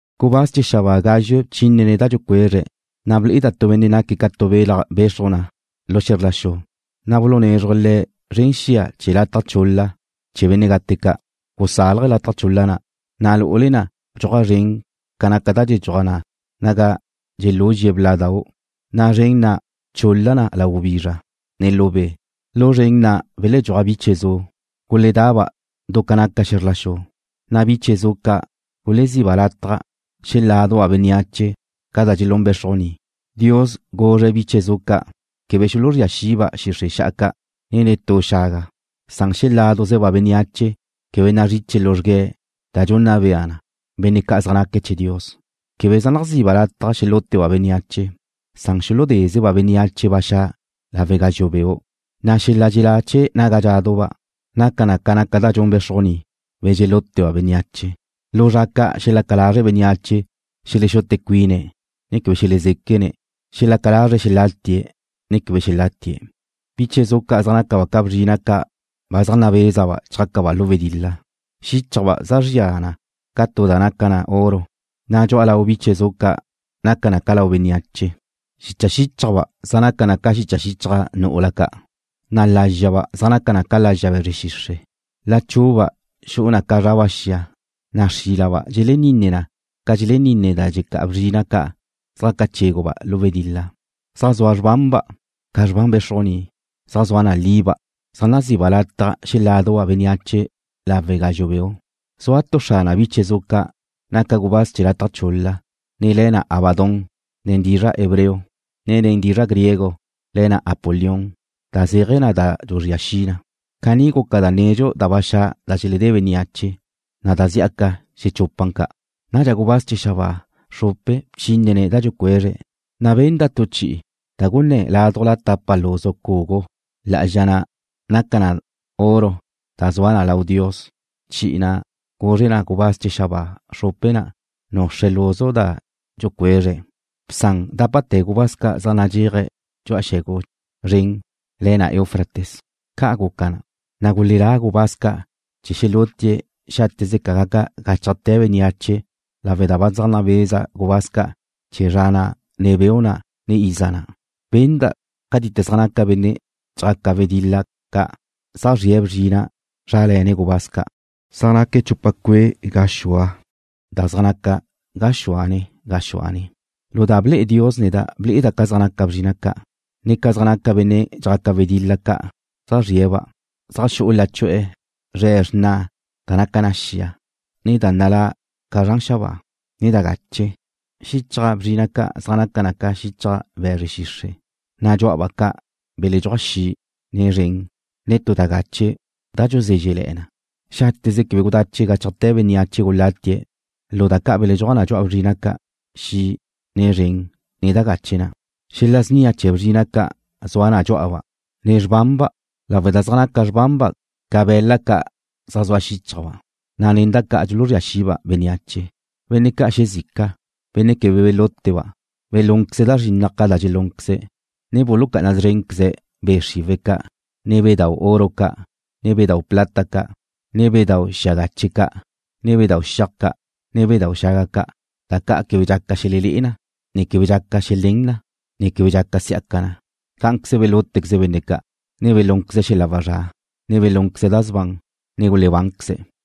Gubáz chee̱ xabáa gázxue bchínene̱' da dxucuezre̱', na' ble'eda' tu benne' naque̱' ca tu belaj bexruj na lu xe̱zr la xu, na' bulunézruje̱' le̱' zren xia chee̱ lataj chul-la chee̱ benne' gate ca'. Gusálaje̱' lataj chul-la na', na' lu'ule na' bdxuaj zren ca naca da dxedxuaj na naga dxeluzre̱' bla'dau', na' zren na' bchul-la na lau gubizra, ne lu be'. Lu zren na' beledxúaj biche zu. Guledaba' du ca naca xe̱zr la xu, na' biche zu ca' guleziba' lataj xeláduba' bénneache ca da dxelún bé̱xrujni. Dios guzre̱' biche zu ca' quebe xuluzría xiba' xixre' xa'a ca', ne netú xaga, san xeláduzeba' bénneache quebe nazriche luzrgue̱' da dxunna bea na benne' ca' zaj naque̱' chee̱ Dios. Quebe zaj naziba' lataj xelúteba' bénneache, san xuludézeba' bénneache ba xa' lawe' gazxu' beu', na' xel-la' dxelá chee̱ naga dxeláduba' naca na ca naca da dxun bé̱xrujni, be̱ dxelúteba' bénneache. Lu zra ca' xelaca lazre' bénneache xelexute cuine̱', ne quebe xelezéquene̱'. Xelaca lazre̱' xelatie̱' ne quebe xelatie̱'. Biche zu ca' zaj nácaba' ca bzrina' ca' ba zaj nabézaba' chjácaba' lu wedil-la. Xíchajba' zaj zria na ca tu da naca na oro, na' dxu'a lau biche zu ca' naca na ca lau bénneache. Xicha xíchajba' zaj naca na ca xicha xichaj nu'ula ca', na' lázxaba' zaj naca na ca lazxa be̱zre xixre'. Lachu'uba' xu'u na ca zraba' xia, na' xrílaba' dxeleninne na ca dxeleninne da dxelecá'a bzrina' ca' zjaca chéguba' lu wedil-la. Zaj zua xrbanba' ca xrban bé̱xrujni, zaj zua na liba'. Zaj nazi'ba' lataj xeláduba' bénneache lawe' gazxu' beu'. Zua tu xrane biche zu ca' naca gubáz chee̱ lataj chul-la, ne le̱ na Abadón nen dizra' hebreo, ne nen dizra' griego le̱ na Apolión, da zéaje̱ na da dxuzría xi na. Caní guca da nedxu da ba xa' da xeledé bénneache, na' da' zí'aca xechupan ca'. Nadxa gubáz chee̱ xabáa xrupe bchínene̱' da dxucuezre̱', na' benda' tu chi'i da gunná ládujla tapa luzu cugu lá'azxa na' naca na oro da zua na lau Dios. Chi'i na' guzre na gubáz chee̱ xabáa xrupe na' nuxre̱' luzu da dxucuezre̱': ―Bsan dápate̱ gubáz ca' zaj nadxéaje̱' dxu'a xe̱gu zren le̱ na Eufrates. Ca' guca na, na' gulelá gubáz ca' chee̱ xelutie̱' xáteze ca gaca gáchajte̱ bénneache lawe' da ba zaj nabeza gubáz ca' chee̱ zra na', ne beu' na', ne iza na'. Benda' cátite zaj naca benne' dxjaca wedil-la ca' zaj zrie̱' bzrina' zrále̱ne̱' gubáz ca'. Zaj naque̱' chupa cue' gaxua da zaj naca gaxúane gaxúane. Lu da ble'e Dios neda' ble'eda' ca zaj naca bzrina' ca', ne ca zaj naca benne' dxjaca wedil-la ca' zaj zrie̱'-ba'. Zaj xu'u lachu'e̱ zre̱' xrna da naca na xia, ne da nalá' ca zran xabáa, ne da gache. Xichaj bzrina' ca' zaj naca na ca xichaj be̱zre xixre', na' dxú'aba' ca' beledxúaj xi', ne zren, ne tu da gache da dxuzézxele̱'e̱ na. Xáteze quebe gudache gáchajte̱ bénneache gulatie̱' lu da ca' beledxúaj na dxu'a bzrina' ca', xi', ne zren, ne da gache na'. Xel-la' snia chee̱ bzrina' ca' zua na dxú'aba', ne xrbanba' lawe' da zaj naca xrbanba' ca be̱la' ca' zaj zua xíchajba', na' nen da ca' dxuluzría xiba' bénneache. Benne' ca' xezica, benne' quebe belúteba', belúnqueze̱' da zrinnaj ca da dxelúnqueze̱', ne bulucá'ana szrénqueze̱' be' xriwe̱' ca', ne bedau' oro ca', ne bedau' plata ca', ne bedau' xia gache ca', ne bedau' xiaj ca', ne bedau' xaga ca', da ca' quebe dxaca xelelé'e na, ne quebe dxaca xelén na, ne quebe dxaca si'aca na. Cá'anqueze belútequeze̱' benne' ca', ne belúnqueze̱' xel-la' wazrá', ne belúnqueze̱' da sban, ne gulebánqueze̱'.